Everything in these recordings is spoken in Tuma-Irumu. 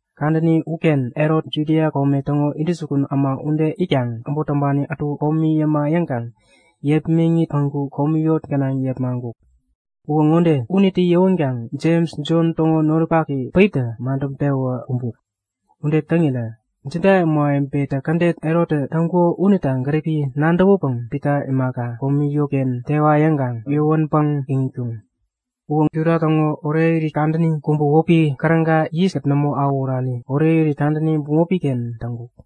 Kadäni uken Herot Judia kome täŋo intäjukun äma ude itkaŋ äbot täŋpani ätu komi yäma yäŋkaŋ yepmäŋit päŋku komi yot gänaŋ yepmaŋkuk. Uwä ŋode; Unitä yäwänkaŋ Jems, Jon täŋo noripak päiptä madäŋpewä kumbuk. Ude täŋirä Juda ämawebetä kädet Herottä täŋkuko unita gäripi nadäwäpäŋ Pita imaka, komi yotken tewa yäŋkaŋ yäwänpäŋ iŋitkuŋ. Uwä Juda täŋo orekirit kadäni kubä wäpi Käräga yiskät nämo awähurani orekirit kadäni bämopi-ken täŋkuk.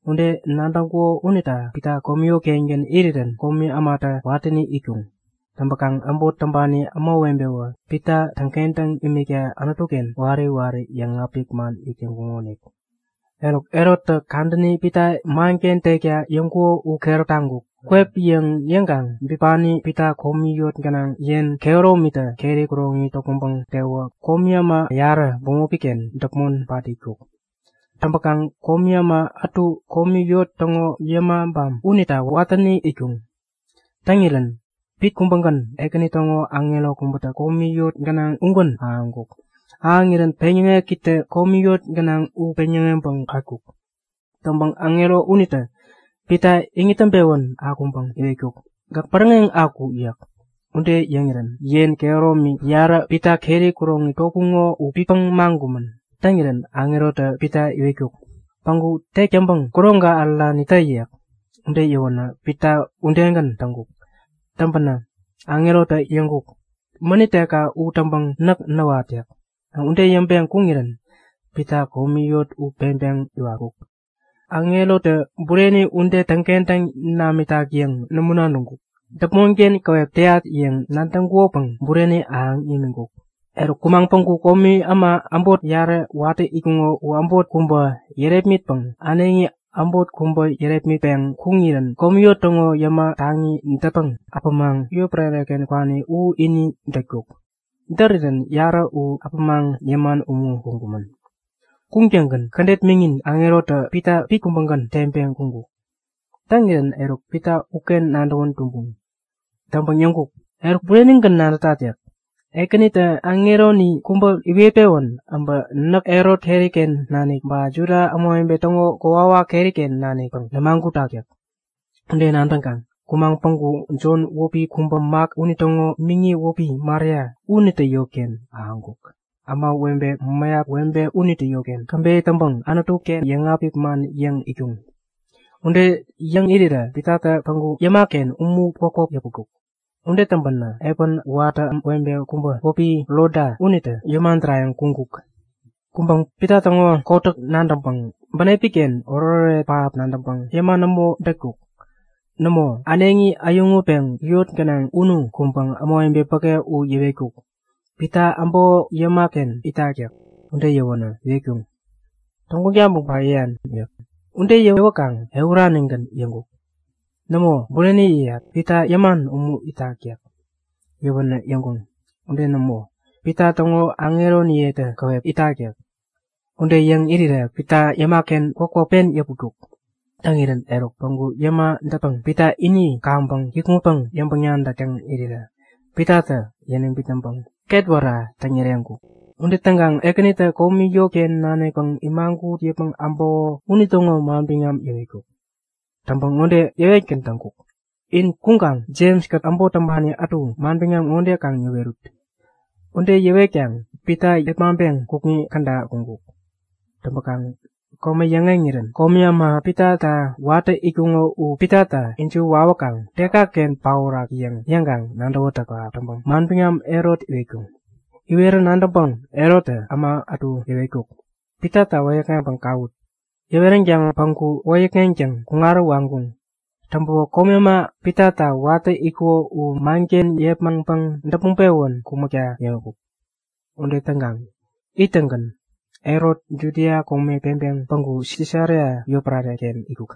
Ude nadäŋkuko unita Pita komi yot-kengän irirän komi ämatä watäni itkuŋ. Täŋpäkaŋ äbot täŋpani ämawebetäwä Pita täŋkentäŋ imikta Anutu-ken wari wari yäŋapik man yäk täŋkuŋonik. Eruk, Herottä kadäni Pita manken tekta yäŋkuko u keräp taŋkuk. Kwep yäŋ yäŋkaŋ bipani Pita komi yot gänaŋ yen kehäromitä keri kuroŋi topmäŋpäŋ tewä komi äma yarä bämopi-ken däpmon pat itkuk. Täŋpäkaŋ komi äma ätu komi yot täŋo yämabam unita watäni itkuŋ. Täŋirän pit kubägän Ekäni täŋo aŋero kubätä komi yot gänaŋ ugän ahäŋkuk. Ahäŋirän peŋyäŋekitä komi yot gänaŋ u peŋyäŋeŋpäŋ patkuk. Täŋpäŋ aŋero unitä Pita iŋit täŋpewän akwänpäŋ iwetkuk; Gäk bäräŋeŋ aku! yäk. Ude yäŋirän yen kehäromi yarä Pita keri kuroŋi topuŋo u pitpäŋ maŋkumän. Täŋirän aŋerotä Pita iwetkuk; Päŋaku tek täŋpäŋ kuroŋka ärärani tä yäk. Ude yäwänä Pita udegän täŋkuk. Täŋpänä aŋerotä yäŋkuk; Mänit tekka u täŋpäŋ näk näwat yäk. Ude yäŋpeŋ kuŋirän Pita komi yot u peŋpeŋ iwatkuk. Aŋerotä bureni ude täŋkentäŋ namitak yäŋ nämo nadäŋkuk, däpmonken käwep täyat yäŋ nadäŋkukopäŋ bureni ahäŋ imiŋkuk. Eruk kumaŋ päŋku komi äma äbot yarä watä itkuŋo u äbot kubä yärepmitpäŋ äneŋi äbot kubä yärepmitpeŋ kuŋirän komi yot täŋo yäma taŋi dätpäŋ äpämaŋ yotpärare-ken kwani u ini dätkuk. Därirän yarä u äpämaŋ yäman umu kuŋkumän. Kuŋtäŋgän kädet miŋin aŋerotä Pita pit kubägän teŋpeŋ kuŋkuk. Täŋirän eruk Pita uken nadäwän tumbuŋ. Täŋpäŋ yäŋkuk; Eruk, burenigän nadätat yäk. Ekänitä aŋeroni kubä iwet-pewän äbä näk Herot keri-ken nanik ba Juda ämawebe täŋo kokwawak keri-ken nanikpäŋ nämagutak yäk. Ude nadäŋkaŋ kumaŋ päŋku Jon wäpi kubä Mak unitäŋo miŋi wäpi Maria unitä yotken ahäŋkuk. Ämawebe mäyap webe unitä yotken käbeyä täŋpäŋ Anutu-ken yäŋapik man yäŋ itkuŋ. Ude yäŋ irirä Pitatä päŋku yäma-ken umu kwäpkwäp yäputkuk. Ude täŋpänä epän watä webe kubä wäpi Roda unitä yäma därayäŋ kuŋkuk. Kuŋpäŋ Pita täŋo kotäk nadäŋpäŋ bänepi-ken oretoret pähap nadäŋpäŋ yäma nämo dätkuk. Nämo, äneŋi äyäŋutpeŋ yot gänaŋ unu kuŋpäŋ ämawebe päke u yäwetkuk; Pita äbäko yäma-ken itak yäk. Ude yäwänä iwetkuŋ; Täŋguŋ taŋpäŋ ba yäyan yäk. Ude yäwäkaŋ ehuranigän yäŋkuk; Nämo! Bureni yäyat! Pita yäman umu itak yäk. Yäwänä yäŋkuŋ; Ude nämo, Pita täŋo aŋeronitä käwep itak yäk. Ude yäŋ irirä Pita yäma-ken kwäpkwäp pen yäpuritkuk. Täŋirän eruk päŋku yäma dätpäŋ Pita ini kaŋpäŋ kikŋutpäŋ yäŋpäŋ-nadäk täŋ irirä Pitatä yäniŋ bitnäŋpäŋ ketwära täŋyäreŋkuk. Ude täŋkaŋ Ekänitä komi yotken nanikpäŋ imagut yäpmäŋ äbäko unitäŋo manbiŋam yäwetkuk. Täŋpäŋ ŋode yäwetgän täŋkuk; In kuŋkaŋ Jems-kät äbot täŋpani ätu manbiŋam ŋo kaŋ yäwerut. Ude yäwetkaŋ Pita yepmaŋpeŋ kukŋi käda kuŋkuk. Täŋpäkaŋ kome yäŋeŋirän komi äma Pitata watä itkuŋo u Pitata ijiwä wawäkaŋ dekaken paorak yäŋ yäŋkaŋ nadäwätäk pähap täŋpäŋ manbiŋam Herot iwetkuŋ. Iwerä nadäŋpäŋ Herottä äma ätu yäwetkuk; Pitata wäyäkŋeŋpäŋ kawut! Yäweränkaŋ päŋku wäyäkŋeŋtäŋ kuŋarä waŋkuŋ. Täŋpäwä komi äma Pitata watä itkuŋo u manken yepmaŋpäŋ däpmäŋ-pewän kumäkta yäŋkuk. Ude täŋkaŋ ittäŋgän Herot Judia kome peŋpeŋ päŋku Sisaria yotpärare-ken itkuk.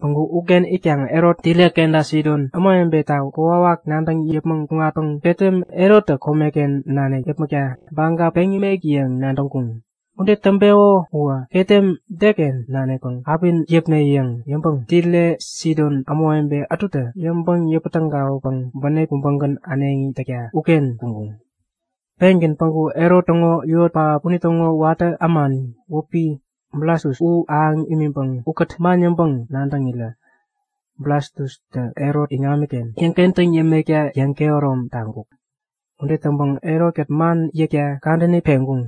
Päŋku uken itkaŋ Herot Tire kenta Sidon ämawebeta kokwawak nadäŋ yäpmäŋ kuŋatpäŋ ketem Herottä komeken nanik yäpmäkta baga peŋ nimek yäŋ nadäŋkuŋ. Ude täŋpeko uwä ketem deken nanikpäŋ api yäpne yäŋ yäŋpäŋ Tire Sidon ämawebe ätutä käbeyä täŋpäŋ yäŋpäŋ-yäpä-tägawäkaŋ bänep kubägän äneŋi täkta uken kuŋkuŋ. Pengän päŋku Herot täŋo yot pähap unitäŋo watä ämani wäpi Blastus u ahäŋ imiŋpäŋ ukät man yäŋpäŋ-nadäŋirä Blastustä Herot iŋamiken yäŋkentäŋ yämekta yäŋkehärom taŋkuk. Ude täŋpäŋ Herot-kät man yäkta kadäni peŋkuŋ.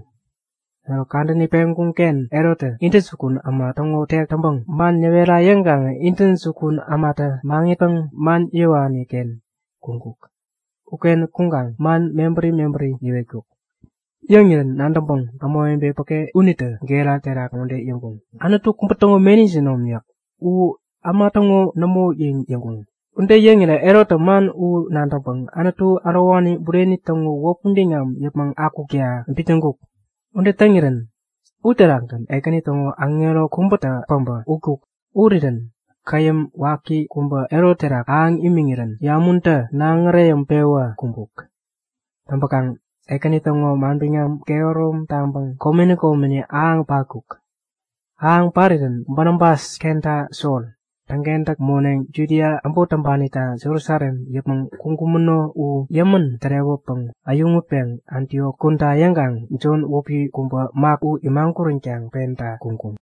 Eruk kadäni peŋkuŋ-ken Herottä intäjukun äma täŋo tek täŋpäŋ man yäwera yäŋkaŋä intäjukun ämatä maŋitpäŋ man yäwani-ken kuŋkuk. Uken kuŋkaŋ man mebäri mebäri yäwetkuk. Yäŋirän nadäŋpäŋ ämawebe päke unitä gera terak ŋode yäŋkuŋ; Anutu kubä täŋo meni jinom yäk. U äma täŋo nämo yäŋ yäŋkuŋ. Ude yäŋirä Herottä man u nadäŋpäŋ Anutu ärowani bureni täŋo wäpi biŋam yäpmäŋ akukta bitnäŋkuk. Ude täŋirän uterakgän Ekäni täŋo aŋero kubätä päbä utkuk. Urirän käyäm waki kubä Herot terak ahäŋ imiŋirän yamuntä naŋ äreyäŋpewä kumbuk. Täŋpäkaŋ Ekäni täŋo manbiŋam kehärom taŋpäŋ komeni komeni ahäŋ patkuk. Ahäŋ parirän Banabas kenta Sol täŋkentäk moneŋ Judia äbot täŋpanita Jerusalem yäpmäŋ kuŋkumäno u yämän tärewäpäŋ äyäŋutpeŋ Antiok kuda yäŋkaŋ Jon wäpi kubä Mak u imaguränkaŋ penta kuŋkuŋ.